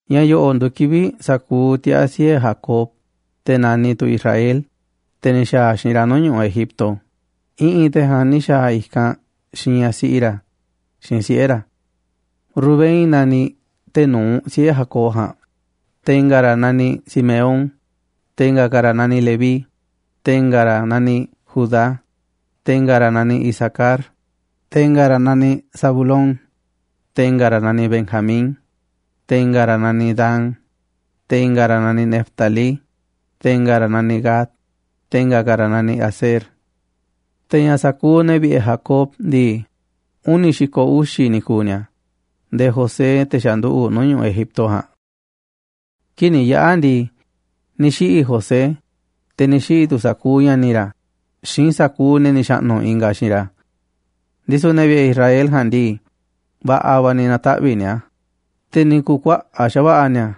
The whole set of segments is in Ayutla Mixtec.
Ña̱ yo̱ꞌo̱ꞌ nduuꞌ kivi̱ꞌ sa̱kuuꞌ tiaa̱ siꞌe̱ Jacob, te̱ naniꞌ tu̱ Israel, te̱ ni̱ xa̱a̱ xiinꞌ ra̱ nuu̱ꞌ ñu̱ꞌuꞌ Egipto, i̱ꞌi̱n te̱ ja̱a̱nꞌ ni̱ xa̱a̱ i̱kanꞌ xiinꞌ ñaꞌ siꞌi ra̱ xiinꞌ siꞌe̱ ra̱. Rubén naniꞌ te̱ nu̱uꞌ siꞌe̱ Jacob ja̱a̱nꞌ, te̱ i̱nga̱ ra̱ naniꞌ Simeón, te̱ i̱nga̱ ka̱ ra̱ naniꞌ Leví, te̱ i̱nga̱ ra̱ naniꞌ Judá, te̱ i̱nga̱ ra̱ naniꞌ Isacar, te̱ i̱nga̱ ra̱ naniꞌ Zabulón, te̱ i̱nga̱ ra̱ naniꞌ Benjamín, te̱ i̱nga̱ ra̱ naniꞌ Dan, te̱ i̱nga̱ ra̱ naniꞌ Neftalí, te̱ i̱nga̱ ra̱ naniꞌ Gad, te̱ i̱nga̱ ka̱ ra̱ naniꞌ Aser. Te̱ ña̱ sa̱kuuꞌ ne̱ vi̱ꞌe̱ Jacob ndii, uni̱ xi̱ko̱ uxi̱ ni̱ ku̱u̱ ni̱a̱ nde̱e̱ José, te̱ xa̱ nduꞌu̱ꞌ nuu̱ꞌ ñu̱ꞌuꞌ Egipto ja̱a̱nꞌ. Kii̱ꞌ ni̱ yaꞌa̱ ndii, ni̱ xiꞌi̱ José, te̱ ni̱ xiꞌi̱ tu̱ sa̱kuuꞌ ña̱ni̱ ra̱ xiinꞌ sa̱kuuꞌ ne̱ ni̱ xa̱ꞌnu̱ ingaꞌ xiinꞌ ra̱. Ndisu̱ ne̱ vi̱ꞌe̱ Israel ja̱a̱nꞌ ndii, va̱ꞌa̱ va̱ ni̱ na̱taꞌvi̱ꞌ ni̱a̱, te̱ ni̱ ku̱kuaꞌa̱ꞌ xa̱va̱ꞌa̱ ni̱a̱,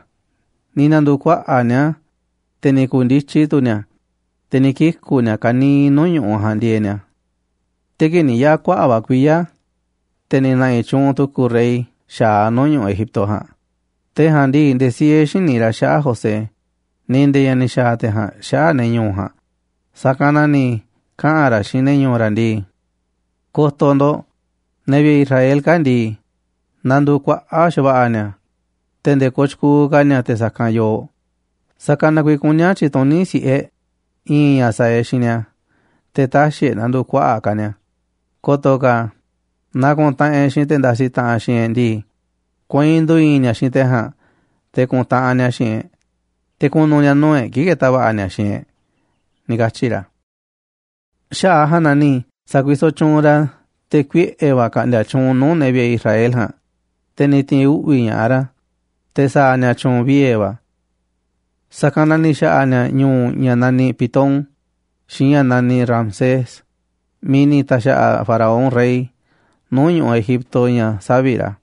ni̱ na̱ndu̱u̱ kuaꞌa̱ꞌ ni̱a̱, te̱ ni̱ ku̱ndityi tu̱ ni̱a̱, te̱ ni̱ kiku̱ ni̱a̱ ka̱niiꞌ nuu̱ꞌ ñu̱ꞌuꞌ ja̱a̱nꞌ ndieeꞌ ni̱a̱. Te̱ kii̱ꞌ ni̱ yaꞌa̱ kuaꞌa̱ꞌ va̱ kuiya̱, te̱ ni̱ na̱ꞌi̱ tyuunꞌ tu̱ku̱ rey xa̱aꞌ nuu̱ꞌ ñu̱ꞌuꞌ Egipto ja̱a̱nꞌ, te̱ ja̱a̱nꞌ ndii, nde̱e̱ siee xïní ra̱ xaꞌa̱ꞌ José, ni̱ nde̱e̱ ña̱ ni̱ xa̱a̱ te̱ ja̱a̱nꞌ xaꞌa̱ꞌ ne̱ ñu̱u̱ ja̱a̱nꞌ, sa̱kanꞌ na̱ ni̱ kaꞌa̱n ra̱ xiinꞌ ne̱ ñu̱u̱ ra̱ ndii: ―Ko̱to̱ ndo̱ꞌ, ne̱ vi̱ꞌe̱ Israel kaa̱ꞌ ndii, nanduuꞌ kuaꞌa̱ꞌ xa̱va̱ꞌa̱ ni̱a̱ te̱ nde̱e̱ kooꞌ tyukuuꞌ ka̱ ni̱a̱ te̱ sa̱kanꞌ yooꞌ. Sa̱kanꞌ na kuiiꞌ kuní a̱ tyi̱tuní si̱ꞌe e̱ꞌ i̱i̱n ña̱ sa̱a̱ e̱ꞌ xiinꞌ ni̱a̱ te̱ tä̱xi̱ e̱ꞌ na̱ndu̱u̱ kuaꞌa̱ꞌ ka̱ ni̱a̱, ko̱to̱ ka̱ naaꞌ ku̱ntaꞌanꞌ e̱ꞌ xiinꞌ te̱ ndasiꞌ taꞌanꞌ xiinꞌ e̱ꞌ ndii, kueinꞌ ndu̱i̱i̱n ni̱a̱ xiinꞌ te̱ ja̱a̱nꞌ te̱ ku̱ntaꞌanꞌ ni̱a̱ xiinꞌ e̱ꞌ, te̱ ku̱nu̱ ni̱a̱ nuu̱ꞌ e̱ꞌ kii̱ꞌ ke̱ta̱ va̱ꞌa̱ ni̱a̱ xiinꞌ e̱ꞌ ―ni̱ katyi̱ ra̱. Xaꞌa̱ꞌ a̱ ja̱a̱nꞌ na ni̱ sa̱kuisoꞌ tyuunꞌ ra̱ te̱ kuiꞌe̱ va̱ ka̱ꞌndi̱a̱ tyuunꞌ nuu̱ꞌ ne̱ vi̱ꞌe̱ Israel ja̱a̱nꞌ, te̱ ni̱ ti̱i̱n uꞌvi̱ ña̱ꞌaꞌ ra̱ te̱ sa̱a̱ ni̱a̱ tyu̱u̱n viee̱ va̱. Sa̱kanꞌ na ni̱ xa̱ꞌa̱ ni̱a̱ ñu̱u̱ ña̱ naniꞌ Pitón xiinꞌ ña̱ naniꞌ Ramsés miiꞌ ni̱ ta̱xa̱ꞌa̱ Faraón rey nuu̱ꞌ ñu̱ꞌuꞌ Egipto ña̱ savi̱ꞌ ra̱.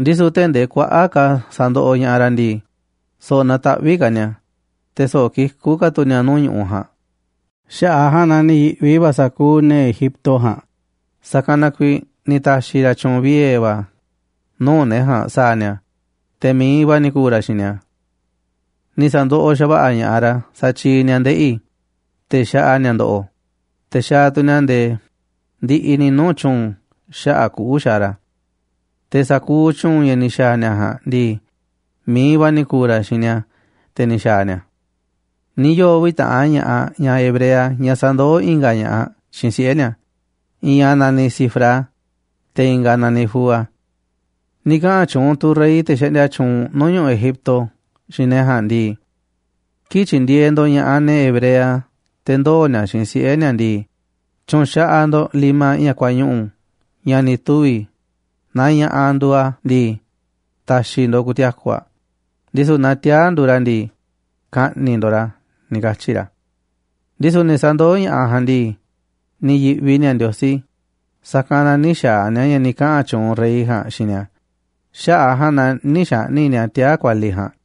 Ndisu̱ tee̱ꞌ ndee kuaꞌa̱ꞌ ka̱ sandoꞌoꞌ ña̱ꞌaꞌ ra̱ ndii, so̱ꞌo̱ nataꞌvíꞌ ka̱ ni̱a̱, te̱ so̱ꞌo̱ kikú ka̱ tu̱ ni̱a̱ nuu̱ꞌ ñu̱ꞌuꞌ ja̱a̱nꞌ, xaꞌa̱ꞌ a̱ ja̱a̱nꞌ na ni̱ yi̱ꞌvi va̱ sa̱kuuꞌ ne̱ Egipto ja̱a̱nꞌ. Sa̱kanꞌ na kuiiꞌ ni̱ ta̱xi̱ ra̱ tyu̱u̱n viee̱ va̱ nuu̱ꞌ ne̱ ja̱a̱nꞌ sa̱a̱ ni̱a̱, te̱ mi̱iꞌ va̱ ni̱ ku̱u̱ ra̱ xiinꞌ ni̱a̱. Ni̱ sa̱ndoꞌoꞌ xa̱va̱ꞌa̱ ña̱ꞌaꞌ ra̱ satyiiꞌ ni̱a̱ ndeꞌi̱ te̱ xaꞌa ni̱a̱ ndo̱ꞌo̱, te̱ xaaꞌ tu̱ ni̱a̱ nde̱e̱ ndiꞌiꞌ ni̱ nuu̱ꞌ tyu̱u̱n xaꞌa̱ꞌ kuꞌu̱ xaaꞌ ra̱. Te̱ sa̱kuuꞌ tyu̱u̱n ña̱ ni̱ xa̱a̱ ni̱a̱ ja̱a̱nꞌ ndii, mi̱iꞌ va̱ ni̱ ku̱u̱ ra̱ xiinꞌ ni̱a̱ te̱ ni̱ xa̱a̱ ni̱a̱ a̱. Ni̱ yoo̱ uvi̱ taꞌan ña̱ꞌaꞌ ñaꞌ hebrea ñaꞌ sandoó i̱nga̱ ña̱ꞌaꞌ xiinꞌ siꞌe̱ ni̱a̱, i̱i̱n aꞌ naniꞌ Sifrá, te̱ i̱nga̱ aꞌ naniꞌ Fúa. Ni̱ kaꞌa̱n tyuunꞌ tu̱ rey, te̱ xaꞌndia tyuunꞌ nuu̱ꞌ ñu̱ꞌuꞌ Egipto, xiinꞌ ne̱ ja̱a̱nꞌ ndii: ―Kii̱ꞌ tyindieeꞌ ndo̱ꞌ ña̱ꞌaꞌ ne̱ hebrea te̱ ndoo̱ ni̱a̱ xiinꞌ siꞌe̱ ni̱a̱ ndii, tyu̱nxaꞌaꞌ ndo̱ꞌ limaꞌ ña̱ kuañuꞌu̱ ña̱ ni̱ tuvi̱, naaꞌ ña̱ꞌaꞌ nduuꞌ aꞌ ndii, ta̱xi̱ ndo̱ꞌ ku̱ti̱a̱ku̱ aꞌ, ndisu̱ naaꞌ tiaa̱ nduuꞌ ra̱ ndii, ka̱ꞌni̱ꞌ ndo̱ꞌ ra̱ ―ni̱ katyi̱ ra̱. Ndisu̱ ne̱ sandoó ña̱ꞌaꞌ ja̱a̱nꞌ ndii, ni̱ yi̱ꞌvi ni̱a̱ Ndiosí, sa̱kanꞌ na nï̱ xa̱a̱ ni̱a̱ ña̱ ni̱ kaꞌa̱n tyuunꞌ rey ja̱a̱nꞌ xiinꞌ ni̱a̱, xaꞌa̱ꞌ a̱ ja̱a̱nꞌ na nï̱ xa̱ꞌni̱ꞌ ni̱a̱ tiaa̱ kualiꞌ ja̱a̱nꞌ.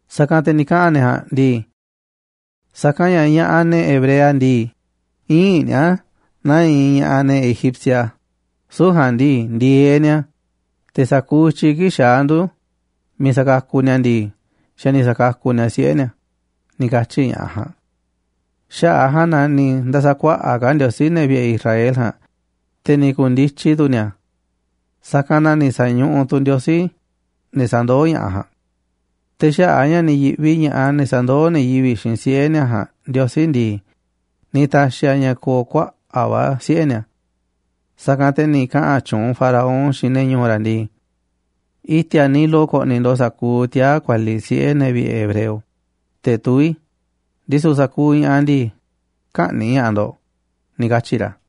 Sa̱kanꞌ te̱ ni̱ kaꞌa̱n ne̱ ja̱a̱nꞌ ndii: ―Sa̱kanꞌ ña̱ ña̱ꞌaꞌ, ne̱ hebrea ndii, ïinꞌ ni̱a̱ naa iinꞌ ña̱ꞌaꞌ ne̱ egipcia, süu̱ꞌ ja̱a̱nꞌ ndii, ndi̱e̱eꞌ ni̱a̱, te̱ sa̱kuuꞌ i̱tyiꞌ kii̱ꞌ xaá ndu̱ miiꞌ sakakuꞌ ni̱a̱ ndii, xa̱ ni̱ sa̱kakuꞌ ni̱a̱ siꞌe̱ ni̱a̱ ―ni̱ katyi̱ ña̱ꞌaꞌ ja̱a̱nꞌ. Xaꞌa̱ꞌ a̱ ja̱a̱nꞌ na ni̱ nda̱sa̱kuaꞌa̱ꞌ ka̱ Ndiosí ne̱ vi̱ꞌe̱ Israel ja̱a̱nꞌ, te̱ ni̱ ku̱ndityi tu̱ ni̱a̱. Sa̱kanꞌ na ni̱ sa̱ñuꞌuꞌ tu̱ Ndiosí ne̱ sandoó ña̱ꞌaꞌ ja̱a̱nꞌ. Te̱ xaꞌa̱ꞌ a̱ ña̱ ni̱ yi̱ꞌvi ña̱ꞌaꞌ ne̱ sandoó ne̱ yivi̱ꞌ xiinꞌ siꞌe̱ ni̱a̱ ja̱a̱nꞌ Ndiosí ndii, ni̱ ta̱xi̱ a̱ ña̱ ko̱o̱ kuaꞌa̱ꞌ va̱ siꞌe̱ ni̱a̱. Sa̱kanꞌ te̱ ni̱ kaꞌa̱n tyuunꞌ Faraón xiinꞌ ne̱ ñu̱u̱ ra̱ ndii: ―I̱ti̱a̱ Nilo ko̱ꞌni̱ ndo̱ꞌ sa̱kuuꞌ tiaa̱ kualiꞌ siꞌe̱ ne̱ vi̱ꞌe̱ hebreo, te̱ tuví, ndisu̱ sa̱kuuꞌ ña̱ꞌaꞌ ndii, kä̱ꞌni̱ꞌ ña̱ꞌaꞌ ndo̱ꞌ ―ni̱ katyi̱ ra̱.